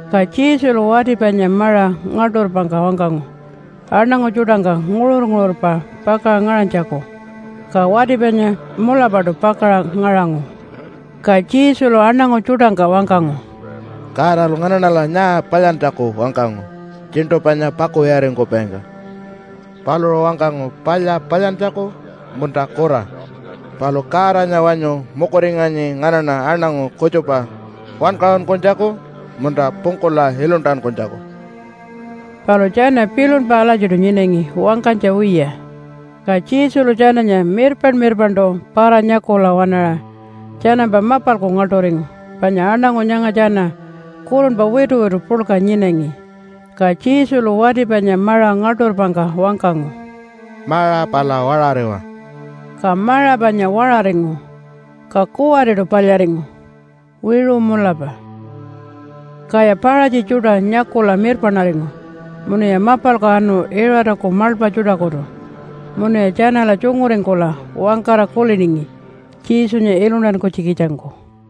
Ka Jesulu wati panya maṟa ngaḻṯurpangka wangkangu aṉangu tjuṯangka nguṟur-nguṟurpa pakaṟa ngaṟanytjaku. Ka wati panya mulapaṯu pakaṟa ngaṟangu. Ka Jesulu aṉangu tjuṯangka wangkangu, “Godalu nganaṉala nyaa palyantjaku wangkangu tjiṉṯu panya pakuwiyaringkupaingka? Paluṟu wangkangu palya palyantjaku munta kura? Palu Godanya wanyu mukuringanyi nganaṉa aṉangu kutjupa wankaṟunkunytjaku munta pungkula iluntankunytjaku?” Palu tjana pilunpa alatjiṯu nyinangi wangkanytja wiya. Ka Jesulu tjananya mirpaṉ-mirpaṉṯu para-nyakula waṉaṟa tjanampa mapalku ngaḻṯuringu panya aṉangu nyanga tjana kurunpa wituwitu puḻka nyinangi. Ka Jesulu wati panya maṟa ngaḻṯurpangka wangkangu, “Maṟa pala waṟariwa.” Ka maṟa panya waṟaringu, ka kuwariṯu palyaringu, wiṟu mulapa. Kaya Paṟatji tjuṯa nyakula mirpaṉaringu munuya mapalku anu Iṟataku maḻpa tjuṯakutu. Munuya tjanala tjunguringkula wangkara kuliningi Jesunya iluntankunytjikitjangku.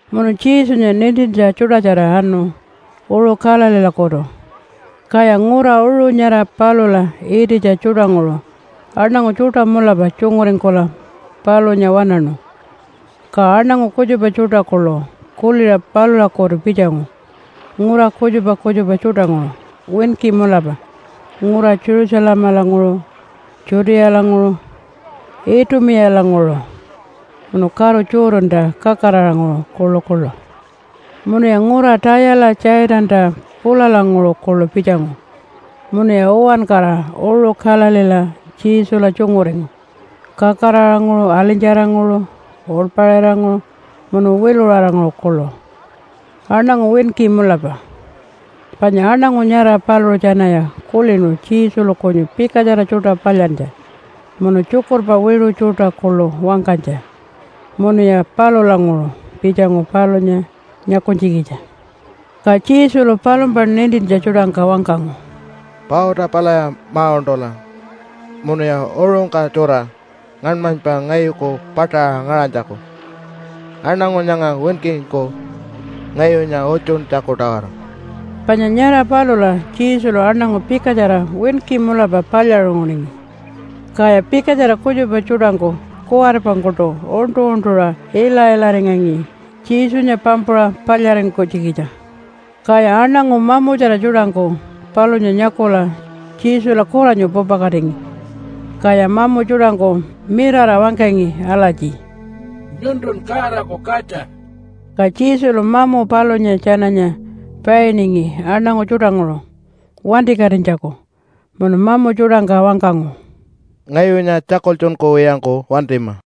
Munu Jesunya nintintja tjuṯatjara anu uṟu Galileelakutu, kaya ngura uṟu nyara palula ititja tjuṯanguṟu aṉangu tjuṯa mulapa tjunguringkula palunya waṉaṉu. Ka aṉangu kutjupa tjuṯa kuḻu kuliṟa palulakutu pitjangu ngura kutjupa kutjupa tjuṯanguṟu winki mulapa ngura Jerusalemalanguṟu, Judealanguṟu, Itumiyalanguṟu, munu karu Jordanta kakaraṟanguṟu kuḻukuḻu. Munuya ngura Tayala Tjaitanta pulalanguṟu kuḻu pitjangu munuya uwankara uṟu Galileela Jesula tjunguringu kakaraṟanguṟu, alinytjaranguṟu, uḻpaṟiranguṟu, munu wiluṟaranguṟu kuḻu, aṉangu winki mulapa. Panya aṉangu nyara paluṟu tjanaya kulinu Jesulu kunyu pikatjara tjuṯa palyantja munu tjukurpa wiṟu tjuṯa kuḻu wangkanytja, munuya palulanguṟu pitjangu palunya nyakunytjikitja. Ka Jesulu palumpa nintintja tjuṯangka wangkangu, “Pauta palaya ma-uṉṯula munuya uṟungka tjura ngaṉmanypa ngayuku paṯaṟa ngaṟanytjaku aṉangu nyanga winkingku ngayunya utjuntjaku-tawara.” Panya nyara palula Jesulu aṉangu pikatjara winki mulapa palyaṟunguningi. Kaya pikatjara kutjupa tjuṯangku kuwaripangkuṯu uṉṯu-uṉṯuṟa ila-ilaringangi Jesunya pampuṟa palyaringkunytjikitja. Kaya aṉangu mamutjara tjuṯangku palunya nyakula Jesula kuranyu pupakatingi, kaya mamu tjuṯangku mirara wangkangi alatji, “Nyuntun Godaku Katja.” Ka Jesulu mamu palunya tjananya painingi aṉangu tjuṯanguṟu wantikatinytjaku munu mamu tjuṯangka wangkangu, “Ngayunya tjakultjunkuwiyangku wantima.”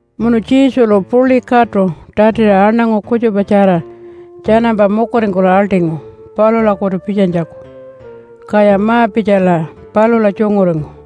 Munu Jesulu puḻi katu tatiṟa aṉangu kutjupatjara tjanampa mukuringkula aḻṯingu palulakutu pitjanytjaku, kaya ma-pitjala palula tjunguringu.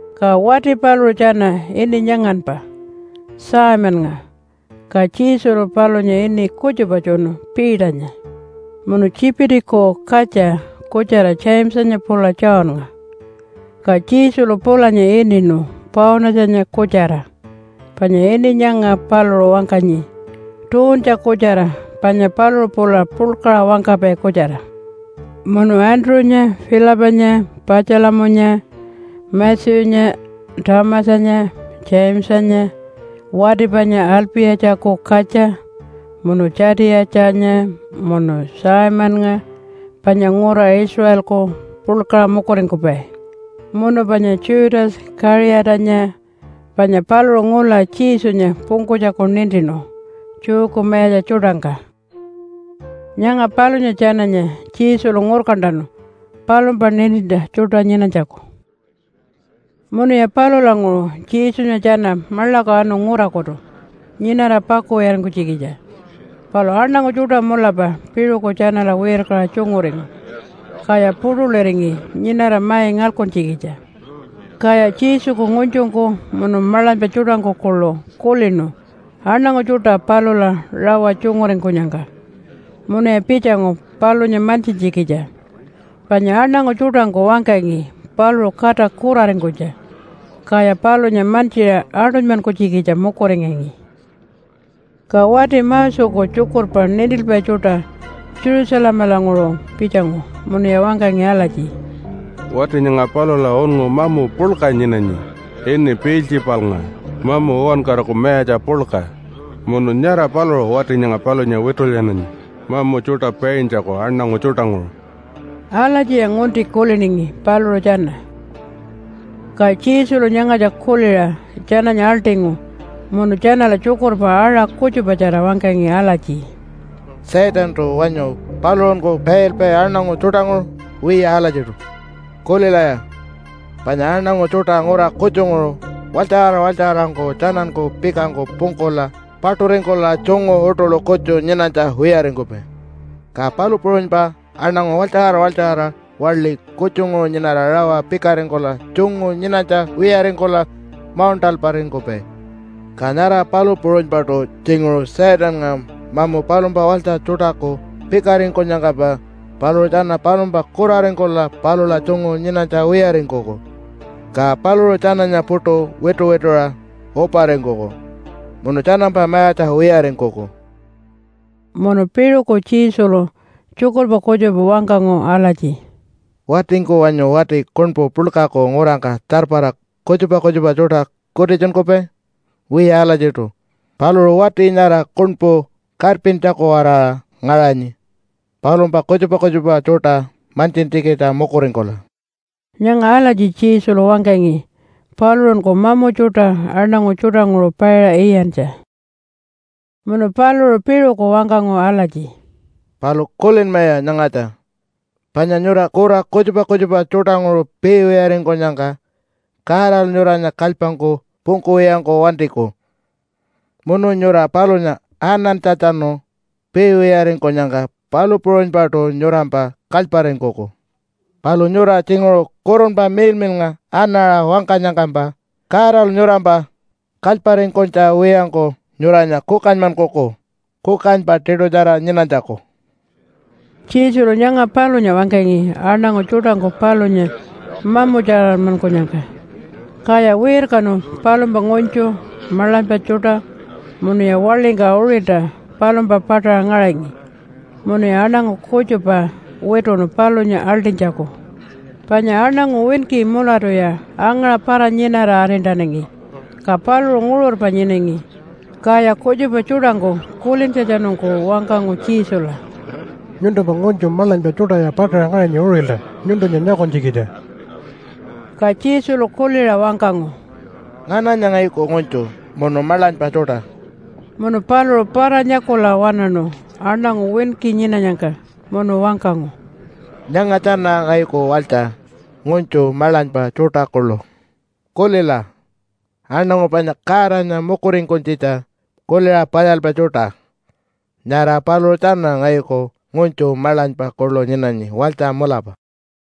Ka wati paluṟu tjana ini nyanganpa, Simonnga, ka Jesulu palunya ini kutjupa tjunu Peternya. Munu Tjipitiku katja kutjara Jamesanya pula Johnnga. Ka Jesulu pulanya ininu Paunatjanya kutjara, panya ini nyanga paluṟu wangkanyi, Tuuntja Kutjara panya paluṟu pula puḻkaṟa wangkapai kutjara. Munu Andrew-nya, Philipanya, Patjalamunya, Matthew-nya, Thomasanya, Jamesanya wati panya Alpi-yatjaku katja, munu Tjatiyatjanya, munu Simonnga panya ngura Israelku puḻkaṟa mukuringkupai. Munu panya Judas Kaṟiyatanya, panya paluṟu ngula Jesunya pungkunytjaku nintinu Jewku mayatja tjuṯangka. Nyanga palunya tjananya Jesulu ngurkantanu palumpa nintintja tjuṯa nyinanytjaku. Munuya palulanguṟu Jesunya tjana maḻaku anu ngurakutu nyinara paku wiyaringkunytjikitja. Palu aṉangu tjuṯa mulapa piṟuku tjanala wirkaṟa tjunguringu, kaya puṯuliringi nyinara mai ngalkuntjikitja. Kaya Jesuku ngunytjungku munu maḻanypa tjuṯangku kuḻu kulinu aṉangu tjuṯa palula rawa tjunguringkunyangka, munuya pitjangu palunya mantjintjikitja. Panya aṉangu tjuṯangku wangkangi paluṟu kata kuraringkunytja, kaya palunya mantjiṟa aṯunymankunytjikitja mukuringangi. Ka wati Moseku tjukurpa nintilpai tjuṯa Jerusalemalanguṟu pitjangu munuya wangkangi alatji, “Wati nyanga palula unngu mamu puḻka nyinanyi, ini Piiltjipalnga, mamu uwankaraku mayatja puḻka. Munu nyara paluṟu wati nyanga palunya witulyananyi mamu tjuṯa paintjaku aṉangu tjuṯanguṟu.” Alatjiya ngunti kuliningi paluṟu tjana. Ka Jesulu nyangatja kuliṟa tjananya aḻṯingu munu tjanala tjukurpa aṟa kutjupatjara wangkangi alatji, “Satantu wanyu paluṟunku pailpai aṉangu tjuṯanguṟu? Wiya alatjiṯu. Kulilaya, panya aṉangu tjuṯa ngura kutjunguṟu walytjaṟara walytjaṟarangku tjananku pikangku pungkula paṯuringkula tjungu uṯuḻu kutju nyinanytja wiyaringkupai. Ka palu puṟunypa aṉangu walytjaṟara walytjaṟara waḻi kutjunguṟu nyinara rawa pikaringkula tjungu nyinanytja wiyaringkula mauṉṯalparingkupai. Ka nyara palu puṟunypaṯu tjinguṟu Satannga mamu palumpa walytja tjuṯaku pikaringkunyangkampa paluṟu tjana palumpa kuraringkula palula tjungu nyinanytja wiyaringkuku, ka paluṟu tjananya puṯu wituwituṟa uparingkuku munu tjanampa mayatja wiyaringkuku.” Munu piṟuku Jesulu tjukurpa kutjupa wangkangu alatji, “Watingku wanyu wati kuṉpu puḻkaku ngurangka tjarpara kutjupa kutjupa tjuṯa kutitjunkupai? Wiya alatjiṯu. Paluṟu wati nyara kuṉpu karpintjaku-waraṟa ngaṟanyi palumpa kutjupa kutjupa tjuṯa mantjintjikitja mukuringkula.” (Nyanga alatji Jesulu wangkangi paluṟunku mamu tjuṯa aṉangu tjuṯanguṟu paiṟa iyantja.) Munu paluṟu piṟuku wangkangu alatji, “Palu kulinmaya nyangatja, panya nyura kura kutjupa kutjupa tjuṯanguṟu piiwiyaringkunyangka Godalu nyuranya kalypangku pungkuwiyangku wantiku. Munu nyura palunya anantjatjanu piiwiyaringkunyangka palu puṟunypaṯu nyurampa kalyparingkuku. Palu nyura tjinguṟu Kurunpa Miḻmiḻnga anaṟa wangkanyangkampa Godalu nyurampa kalyparingkunytja wiyangku nyuranya kukanymankuku, kukanypa tiṯutjara nyinanytjaku.” Jesulu nyanga palunya wangkangi aṉangu tjuṯangku palunya mamutjaranmankunyangka. Kaya wirkanu palumpa ngunytju, maḻanypa tjuṯa munuya waḻingka uṟilta palumpa paṯaṟa ngaṟangi munuya aṉangu kutjupa wituṉu palunya aḻṯinytjaku. Panya aṉangu winki mulatuya angaṟa para-nyinara arintanangi, ka paluṟu nguṟurpa nyinangi. Kaya kutjupa tjuṯangku kulintjatjanungku wangkangu Jesula, “Nyuntumpa ngunytju maḻanypa tjuṯaya paṯaṟa ngaṟanyi uṟilta nyuntunya nyakunytjikitja.” Ka Jesulu kuliṟa wangkangu, “Ngananya ngayuku ngunytju munu maḻanypa tjuṯa?” Munu paluṟu para-nyakula waṉaṉu aṉangu winki nyinanyangka munu wangkangu, “Nyanga tjana ngayuku walytja ngunytju maḻanypa tjuṯa kuḻu. Kulila, aṉangu panya Godanya mukuringkunytjitja kuliṟa palyalpai tjuṯa, nyara paluṟu tjana ngayuku ngunytju maḻanypa kuḻu nyinanyi walytja mulapa.”